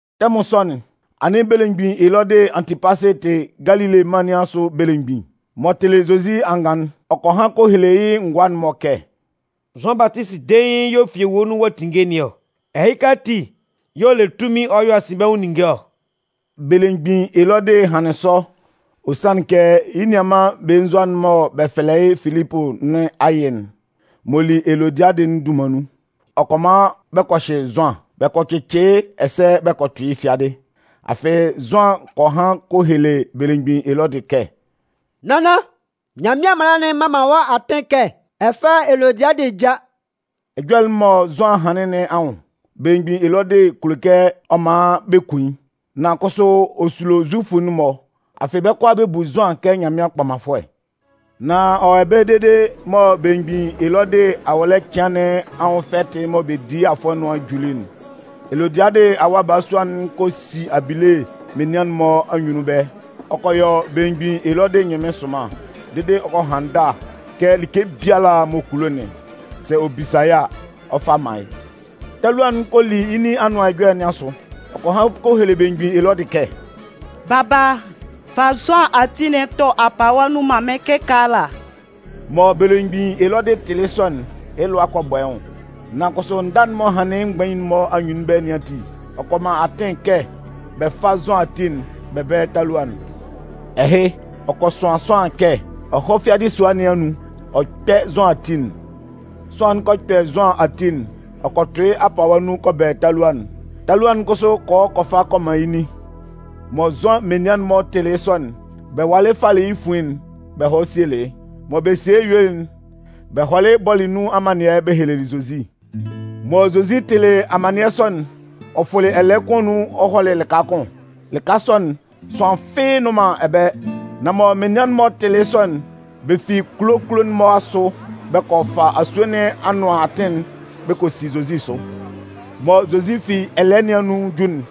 Tɛmʋn sɔ'n, anɩn belemgbin Elɔdɩ Antɩpasɩ tɩ Galile mân nɩn asʋ belemgbin. M'ɔ tɩlɩ Zozi angan'n, ɔ kɔ han kɔ hele yɩ́ ngʋa'n-mɔ kɛ: “Zʋan Batisi dein y'ɔ fi ewue nun ɔ'a tinnge nɩn ɔ! Ɛhɩka ati yɛ̂ ɔ le tunmin ɔ yɔ asinbɛnwʋn ninnge ɔ.” Belemgbin Elɔdɩ hanlɩn sɔ, ɔ sanlɩn kɛ yɩ́ nianman belenzua'n mɔ bɛ fɛlɛ yɩ́ Filipʋ nɩn ayɩ'n m'ɔ li Elodiadɩ'n dunman nun, ɔ kɔ man bɛ kɔ hyɩ Zʋan, bɛ kɔ cɩcɩ yɩ́ ɛsɛ bɛ kɔ tʋ yɩ́ fiadɩ. Afɩ Zʋan kɔ han kɔ hele belemgbin Elɔdɩ kɛ: “Nannan, Nyanmɩan mala'n mman man wɔ́ atɩn kɛ ɛ fá Elodiadɩ já.” Ɛjɔlɛ'n mɔ Zʋan hanlɩn nɩn anwʋn, belemgbin Elɔdɩ kulo kɛ ɔ man bɛ kun yɩ́. Nan kʋsʋ ɔ sulo Zufʋ'n-mɔ. Afɩ bɛ́ kʋalaa, bɛ bu Zʋan kɛ Nyanmɩan kpɔmanfʋɛ. Nan ɔ wɔ ɛbɛlɛ dede mɔ belemgbin Elɔdɩ awɔlɛ cɩan nɩn anwʋn fɛtɩ'n mɔ bɛ di yɩ́ afʋɛ nʋan'n juli'n, Elodiadɩ awa balasua'n kɔ si abile menian'n-mɔ anyunnun ɛbɛlɛ. Ɔ kɔ yɔ belemgbin Elɔdɩ ɛnyɩnmɩn sʋnman dede ɔ kɔ han ndâ kɛ like biala m'ɔ kulo'n, sɛ ɔ bisa a, ɔ 'fa man yɩ́. Talua'n kɔ li yɩ́ nin anʋan ɛjɔlɛ nɩn asʋ. Ɔ kɔ han kɔ hele belemgbin Elɔdɩ kɛ: “Baba, fa Zʋan ati'n tʋ apawa nun man mɩ́n kɩkaala!” Mɔ belemgbin Elɔdɩ tɩlɩ yɩ́ sɔ'n, yɩ́ lʋa kɔ bɔ yɩ́ nwʋn. Nan kʋsʋ ndâ'n m'ɔ hanlɩn yɩ́ mgbain'n-mɔ anyunnun ɛbɛlɛ nɩn ati, ɔ kɔ man atɩn kɛ bɛ fá Zʋan ati'n bɛ bɛ́lɛ talua'n. Ɛhɩ, ɔ kɔ sʋan sʋanlan kɛ ɔ hɔ́ fiadɩ sua nɩn anun ɔ kpɛ́ Zʋan ati'n. Sʋanlan'n kɔ hɔ kɔ kpɛ Zʋan ati'n ɔ kɔ tʋ yɩ́ apawa nun kɔ bɛlɛ talua'n. Talua'n kʋsʋ kɔ hɔ kɔ fa kɔ man yɩ́ nin. Mɔ Zʋan menian'n-mɔ tɩlɩ yɩ́ sɔ'n, bɛ walɩ falɩ yɩ́ fuin'n bɛ hɔlɩ sielɩ yɩ́. Mɔ bɛ sielɩ yɩ́ yuelɩ'n, bɛ hɔlɩ bɔlɩ nun amannɩɛ bɛ helelɩ Zozi. Mɔ Zozi tɩlɩ amannɩɛ sɔ'n, ɔ fʋlɩ ɛlɛɛ kʋn anun ɔ hɔlɩ lɩka kʋn. Lɩka sɔ'n, sʋanlan fɩ́ɩ́ nnʋn man ɛbɛlɛ. Nan mɔ menian'n-mɔ tɩlɩ yɩ́ sɔ'n, bɛ fi kulo kulo'n-mɔ asʋ bɛ kɔ fa asue nɩn anʋan atɩn'n bɛ kɔ si Zozi sʋ. Mɔ Zozi fi ɛlɛɛ nɩn anun 'ju'n,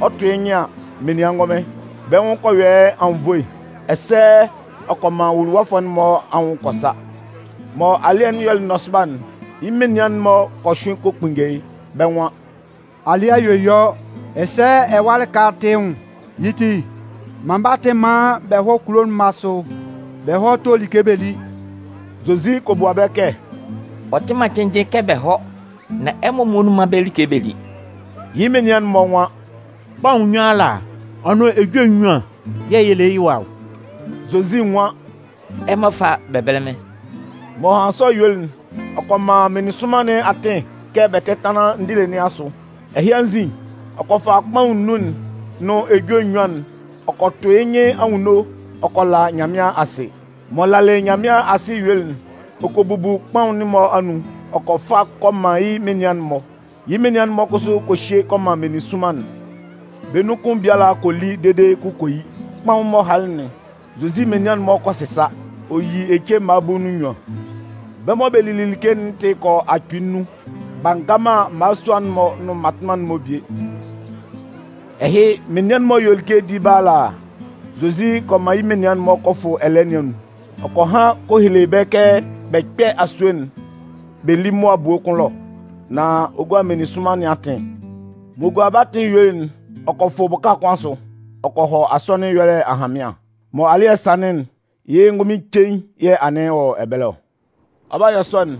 ɔ 'tʋ yɩ́ nyɩn an, menian ngʋnmɩn. Bɛ́ nwʋn kɔ yɔ yɩ́ anwunnvoe, ɛsɛ ɔ kɔ man nwuluwafʋɛ'n-mɔ anwʋn kɔ sa. Mɔ alɩ́ɛ'n yɔlɩ nɔsʋba'n, yɩ́ menian'n-mɔ kɔ hyʋɩn kɔ kpunnge yɩ́. Bɛ́ nwan: “Alɩ́ɛ a yue yɔ ɛsɛ ɛwa lika'n tɩ yɩ́ nwʋn. Yɩ́ ti, man bɛ́ atɩn maan bɛ hɔ́ kulo'n-mɔ asʋ bɛ hɔ́ tó like bɛ lí.” Zozi kɔ bua bɛ kɛ: “Ɔ tɩ man cɩnnjɩn kɛ bɛ hɔ́. Nan ɛmɔ muonun mán bɛ́ like bɛ lí.” Yɩ́ menian'n-mɔ nwan: “Kpaʋn nnun ala ɔ nʋn ejue nnyuan yɛ̂ yɛ le yɩ́ ɛwa ɔ.” Zozi nwan: “Ɛmɔ fá bɛ bɛ́lɛ mɩ́n.” M'ɔ hanlɩn sɔ yuelɩ'n, ɔ kɔ man meninsʋnman nɩn atɩn kɛ bɛ tɛ́tanlan ndile nɩn asʋ. Ɛhɩ anzin, ɔ kɔ fa kpaʋn nnun'n nʋn ejue nnyuan'n ɔ kɔ tʋ yɩ́ nyɩn anwunno ɔ kɔ la Nyanmɩan asɩ. M'ɔ lalɩ Nyanmɩan asɩ yuelɩ'n, ɔ kɔ bubu kpaʋn'n-mɔ anun ɔ kɔ fa kɔ man yɩ́ menian'n-mɔ. Yɩ́ menian'n-mɔ kʋsʋ kɔ hye kɔ man meninsʋnman'n. Bɛ́ nun kʋn biala kɔ li dede yɩ́ kʋ kɔ yi. Kpaʋn'n m'ɔ halɩ'n, Zozi menian'n-mɔ kɔ sɩsa. Ɔ yi ece mma bulu nʋn nnyuan. Bɛ́ mɔ bɛ lili like'n tɩ kɔ yɔ akpɩɩ nnun, b'a nga man mmalasua'n-mɔ nʋn mmatʋnman'n-mɔ bie. Ɛhɩ, menian'n-mɔ yuelɩ like di ɛbɛlɛ ala a, Zozi kɔ man yɩ́ menian'n-mɔ kɔ fʋ ɛlɛɛ nɩn anun. Ɔ kɔ han kɔ hele bɛ́ kɛ bɛ kpɛ́ asue'n bɛ lí mʋa ebue kʋn ɛlɔ nán ɔ 'gua meninsʋnman nɩn atɩn. M'ɔ gualɩ bɛ́ atɩn yuelɩ'n, ɔ kɔ fʋ bʋka kʋn asʋ, ɔ kɔ hɔ asɔnɩn ɛyɔlɛ ahanmɩan. Mɔ alɩ́ɛ sanlɩn'n, yɩ́ ngʋnmɩn cein yɛ̂ anɩn ɔ wɔ ɛbɛlɛ ɔ. Ɔ 'ba yɔ sɔ'n,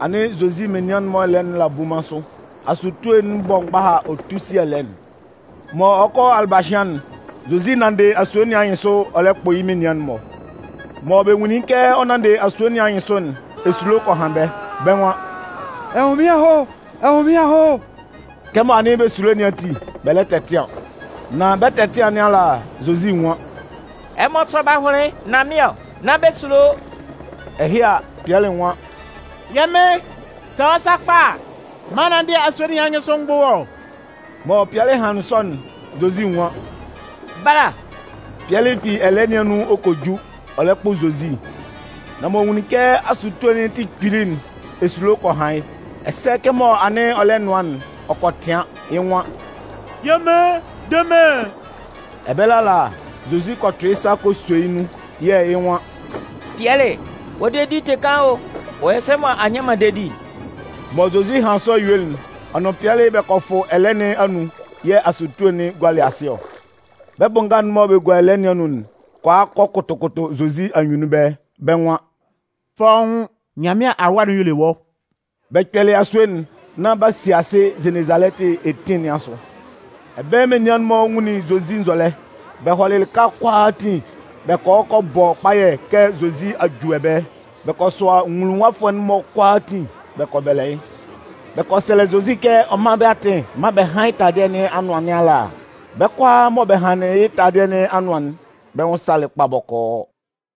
anɩn Zozi menian'n-mɔ ɛlɛɛ'n la bunman sʋ. Asutue'n bɔ mgbaha ɔ tu si ɛlɛɛ'n. Mɔ ɔ 'kɔ alɩbahɩan'n, Zozi nanndɩ asue nɩn anyɩnsʋ ɔ lɛ kpʋ yɩ́ menian'n-mɔ. Mɔ bɛ nwunlin kɛ ɔ nanndɩ asue nɩn anyɩnsʋ'n, esulo kɔ han bɛ́. Bɛ́ nwan: “Ɛnwʋnmɩn aho! Ɛnwʋnmɩn aho!” Kɛmɔ anɩn bɛ sulo nɩn ati, bɛ lɛ tɛtɩan. Nan bɛ 'tɛtɩan nɩn ala, Zozi nwan: “Ɛmɔ sɔ́ bɛ́ ahʋnlɩn nán mɩ́n ɔ. Nán bɛ sulo!” Ɛhɩ a, Pɩɛlɩ nwan: “Yɛ́ Mɩn, sɛ wɔ́ sakpa a, man n nánndɩ asue nɩn anyɩnsʋ m gbʋ́ wɔ́.” Mɔ Pɩɛlɩ hanlɩn sɔ'n, Zozi nwan: “Bala!” Pɩɛlɩ fi ɛlɛɛ nɩn anun ɔ kɔ ju, ɔ lɛ kpʋ Zozi. Nan m'ɔ nwunlin kɛ asutue'n tɩ kpili'n, esulo kɔ han yɩ́. Ɛsɛ kɛmɔ anɩn ɔ lɛ nʋan'n, ɔ kɔ tɩan. Yɩ́ nwan: “Yɛ́ Mɩn, de mɩ́n!” Ɛbɛlɛ ala, Zozi kɔ tʋ yɩ́ sa ɔ kɔ sɔ yɩ́ nun yɛ̂ yɩ́ nwan: “Pɩɛlɩ, wɔ́ dedi'n tɩ kaan o! Ɔ yɔ sɛ mɔ a nnyan man dedi'n?” Mɔ Zozi hanlɩn sɔ yuelɩ'n, ɔ nʋn Pɩɛlɩ bɛ kɔ fʋ ɛlɛɛ nɩn anun yɛ̂ asutue'n gualɩ asɩ ɔ. Bɛ́ bʋ nga'n mɔ bɛ́ gua ɛlɛɛ nɩn anun'n kɔ a kɔ kʋtʋ kʋtʋ Zozi anyunnun ɛbɛlɛ. Bɛ́ nwan: “Fɔ́ʋ́n, Nyanmɩan Awa'n y'ɔ le wɔ́!” Bɛ kpɛlɩ asue'n nán b'a si asɩ Zenezalɛtɩ etin nɩn asʋ. Ɛbɛlɛ menian'n-mɔ nwunlin Zozi nzɔlɛ. Bɛ hɔlɩ lɩka kʋalaatin bɛ kɔ hɔ kɔ bɔ kpayɛ kɛ Zozi a ju ɛbɛlɛ. Bɛ kɔ sʋa nwuluwafʋɛ'n-mɔ kʋalaatin bɛ kɔ bɛlɛ yɩ́. Bɛ kɔ sɛlɛ Zozi kɛ ɔ mán bɛ́ atɩn maan bɛ hán yɩ́ taladɩɛ nɩn anʋan nɩn ala. Bɛ́ kʋalaa mɔ bɛ hanlɩn yɩ́ taladɩɛ nɩn anʋan'n, bɛ́ nwʋn salɩ kpa bɔkɔɔ.